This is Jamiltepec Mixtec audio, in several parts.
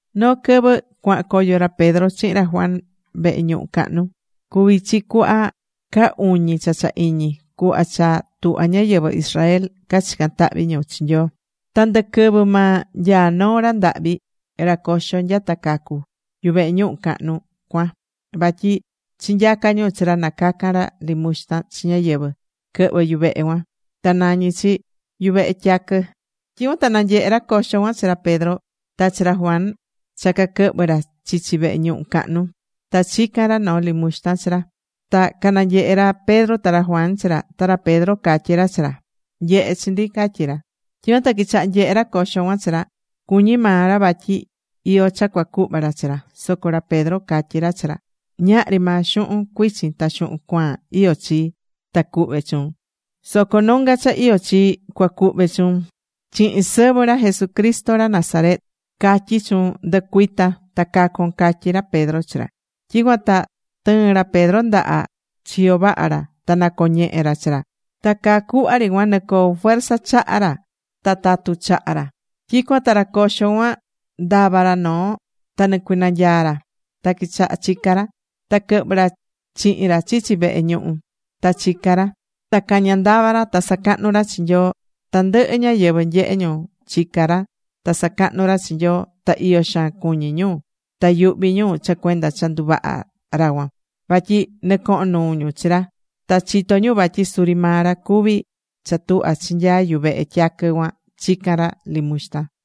Noo quɨvɨ cuahán coyo ra Pedro chihin ra Juan vehe ñuhu cahnu. Cuví chi cuhva caa uñi cha cha iñi, cuhva cha tuhvá ñáyɨvɨ Israel cachicán tahvi ñu chi Nyoo. Ta ndɨ quɨvɨ maa nyaá noo ra ndahvi, ra coxo nyata cacu̱, yuvehe ñuhu cahnu cuan. Vatyi chinyacá ñu chi ra na cacan ra limuxtan chi ñáyɨvɨ quɨhvɨ yuvehe cuan, ta nañí chi: Yuvehe Tyaquɨ. Tyicuan ta nanyehe̱ ra coxo cuan chi ra Pedro ta chi ra Juan cha cuaquɨhvɨ ra chichi vehe ñuhu cahnu. Ta chica̱n ra noo limuxtan chi ra. Ta cananyehe̱ ra Pedro ta ra Juan chi ra. Ta ra Pedro catyí ra chi ra: ―Nye̱he chi ndi ―catyí ra. Tyicuan ta quichaha̱ nyehe ra coxo cuan chi ra. Cuñí maa ra vatyi iyó cha cuacuhva ra chi ra. Soco ra Pedro catyí ra chi ra: ―Ñahri maa xuhun cuichin ta xuhun cuaan iyó chii, ta cuhve chuun. Soco nonga cha iyó chii cua cuhve chuun. Chihin sɨvɨ ra Jesucristo ra Nazaret, catyí chuun, ndɨ̱cuita ta ca̱con ―catyí ra Pedro chi ra. Tyicuan ta tɨɨ̱n ra Pedro ndaha chiyo vaha ra ta nacoñehe̱ ra chi ra. Ta caa cuhva ri cuan nɨcoo̱ fuerza chaha ra ta tatu chaha ra. Tyicuan ta ra coxo cuan ndava̱ ra noo, ta nɨcuinanyaa̱ ra. Ta quichaha̱ chica ra. Ta quɨhvɨ̱ ra chihin ra chichi vehe ñuhu. Ta chicá ra. Ta cañá ndava ra. Ta sacahnú ra chi Nyoo. Tandɨhɨ ñáyɨvɨ nyehe̱ ñu chicá ra ta sacahnú ra chi Nyoo. Ta iyo xaan cuñí ñu ta yuhví ñu cha cuenda cha nduvaha̱ ra cuan. Vatyi nɨcohón nuu ñu chi ra. Ta chitó ñu vatyi suri maa ra cuví cha tuhva chinyaa̱ Yuvehe Tyaquɨ cuan chican ra limuxtan.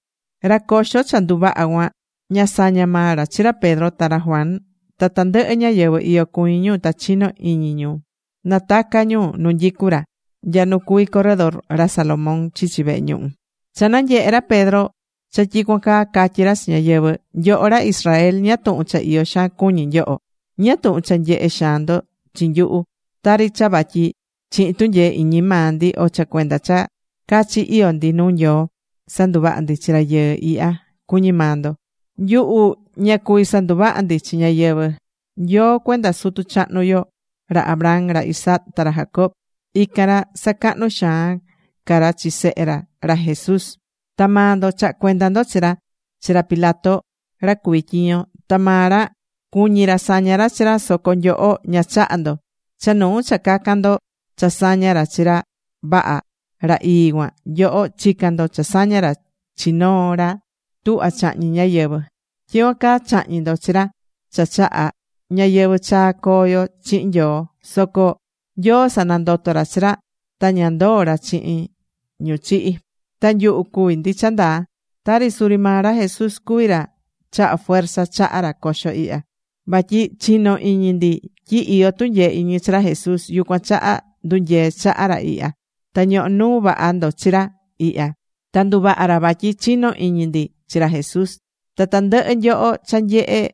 Ra coxo cha nduvaha̱ cuan, ña sañá maa ra chi ra Pedro ta ra Juan. Ta tandɨhɨ ñáyɨvɨ iyo cuñí ñu ta chino̱ ñu nataca̱ ñu nu nyicú ra, nya nu cuví corredor ra Salomón chichi vehe ñuhu. Cha nanyehe̱ ra Pedro cha tyicuan caa, catyí ra chi ñáyɨvɨ: ―Nyoho ra Israel, ¿ñáá tuhun cha iyo xaan cuñí nyoho? ¿Ñáá tuhun cha nyehé xaan ndo chi nyuhu? Tari cha vatyi chihin tunyee iñi maa ndi, o cha cuenda cha cachi iyó ndi nuu Nyoo, sanduvaha̱ ndi chi rayɨɨ ihya, cuñí maa ndo. Nyuhu ña cuví sanduvaha ndi chi ñáyɨvɨ. Nyoo cuenda sutu chahnu yo, ra Abraham, ra Isaac, ta ra Jacob, ican ra sacahnú xaan ca ra chi Sehe ra, ra Jesús. Ta maa ndo chaha̱ cuenda ndo chi ra chi ra Pilato, ra cuví tyiño. Ta maa ra cuñi̱ ra saña ra chi ra. Soco nyoho ña chaha̱ ndo. Cha nuu cha cacan ndo cha saña ra chi ra vaha, ra ii cuan, nyoho chica̱n ndo cha saña ra chi noo ra tuhvá chahñi ñáyɨvɨ. Tyicuan caa chahñi̱ ndo chi ra cha chahá ñayɨvɨ̱ chaa coo yo chihin Nyoo. Soco Nyoo sanandoto̱ ra chi ra. Ta ña ndoo̱ ra chihin ñu chihi̱. Ta nyuhu cuví ndi cha ndaa. Ta suri maa ra Jesús cuví ra chaha̱ fuerza chaha ra coxo ihya. Vatyi chinó iñi ndi tyi iyó tunyee iñi chi ra Jesús. Yucuan chaha ndunyee̱ chaha ra ihya, ta ñohó nuu vaha ndo chi ra ihya. Ta nduvaha̱ ra vatyi chinó iñi ndi chi ra Jesús. Ta tandɨhɨ nyoho cha nyehe̱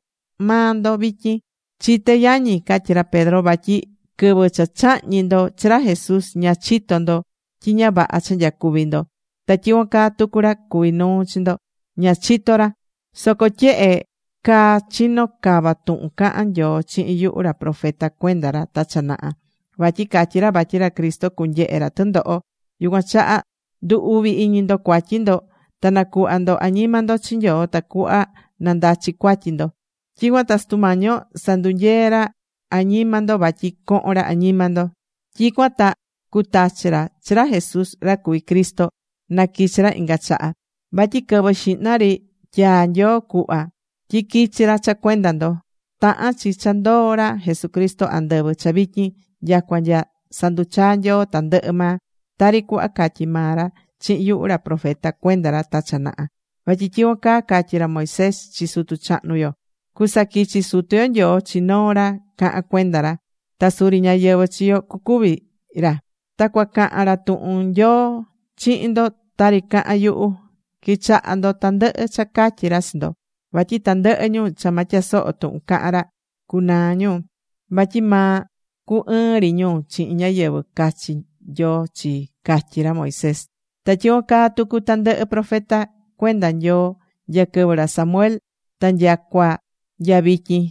maa ndo vityin. ’Chité yañi ―catyí ra Pedro― vatyi quɨvɨ cha chahñi̱ ndo chi ra Jesús, ña chito̱ ndo tyi ña vaha cha nyacuví ndo. Ta tyicuan caa tucu ra cuví nuu chi ndo, ña cachitó ra. Soco tyehe caa chino̱ cava tuhun caha̱n Nyoo chihin yuhu ra profeta cuenda ra ta cha naha, vatyi catyí ra vatyi ra Cristo cunyehe ra tɨndoho. Yucuan chaha ndu̱ uvi iñi ndo cuatyi ndo. Ta na̱cuhva ndo añima ndo chi Nyoo, tacuhva na ndachi cuatyi ndo. Tyicuan ta Sutu Mañi yo sandunyee ra añima ndo vatyi cohon ra añima ndo. Tyicuan ta cutachi ra chi ra Jesús ra cuví Cristo na quichi ra inga chaha. Vatyi quɨvɨ xihna ri tyaa̱ Nyoo cuhva tyi quichi ra cha cuenda ndo. Tahán chi cha ndoó ra Jesucristo andɨvɨ cha vityin nyacua nya sanduchaa Nyoo tandɨhɨ maa. Tari cuhva catyi̱ maa ra chihin yuhu ra profeta cuenda ra ta cha naha. Vatyi tyicuan caa catyi̱ ra Moisés chi sutu chahnu yo: “Cusaquichi Sutu yo Nyoo chi noo ra cahan cuenda ra. Ta suri ñáyɨvɨ chi yo cucuvi ra. Ta cuacahan ra tuhun Nyoo chihin ndo tari cahán yuhu. Qui̱chaha ndo tandɨhɨ cha catyí ra chi ndo. Vatyi tandɨhɨ ñu cha ma tyasoho tuhun cahan ra, cunaa ñu, vatyi ma cu ɨɨn ri ñu chihin ñáyɨvɨ cachi Nyoo chii”, catyí ra Moisés. ’Ta tyicuan caa tucu tandɨhɨ profeta cuenda Nyoo nya quɨvɨ ra Samuel ta nyacua nya vityin,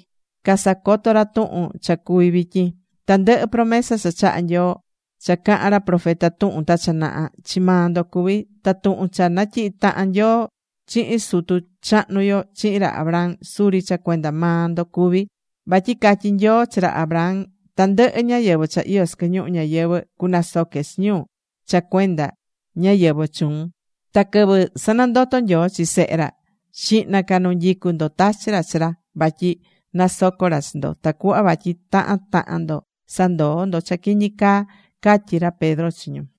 casacoto̱ ra tuhun cha cuví vityin. Tandɨhɨ promesa cha chaha̱ Nyoo cha caha̱n ra profeta tuhun ta cha naha, chi maa ndo cuví. Ta tuhun cha natyihi̱ tahan Nyoo chihin sutu chahnu yo, chihin ra Abraham, suri cha cuenda maa ndo cuví. Vatyi catyi̱ Nyoo chi ra Abraham: “Tandɨhɨ ñáyɨvɨ cha iyó sɨquɨ ñuhu ñayɨvɨ̱ cunasoque chi ñu cha cuenda ñáyɨvɨ chuun.” Ta quɨvɨ sanandoto̱ Nyoo chi Sehe ra, xihna ca nu nyicú ndo tachi̱ ra chi ra, vatyi nasoco ra chi ndo. Tacuhva vatyi tahan tahan ndo sandoo ndo cha quiñi caa ―catyí ra Pedro chi ñu.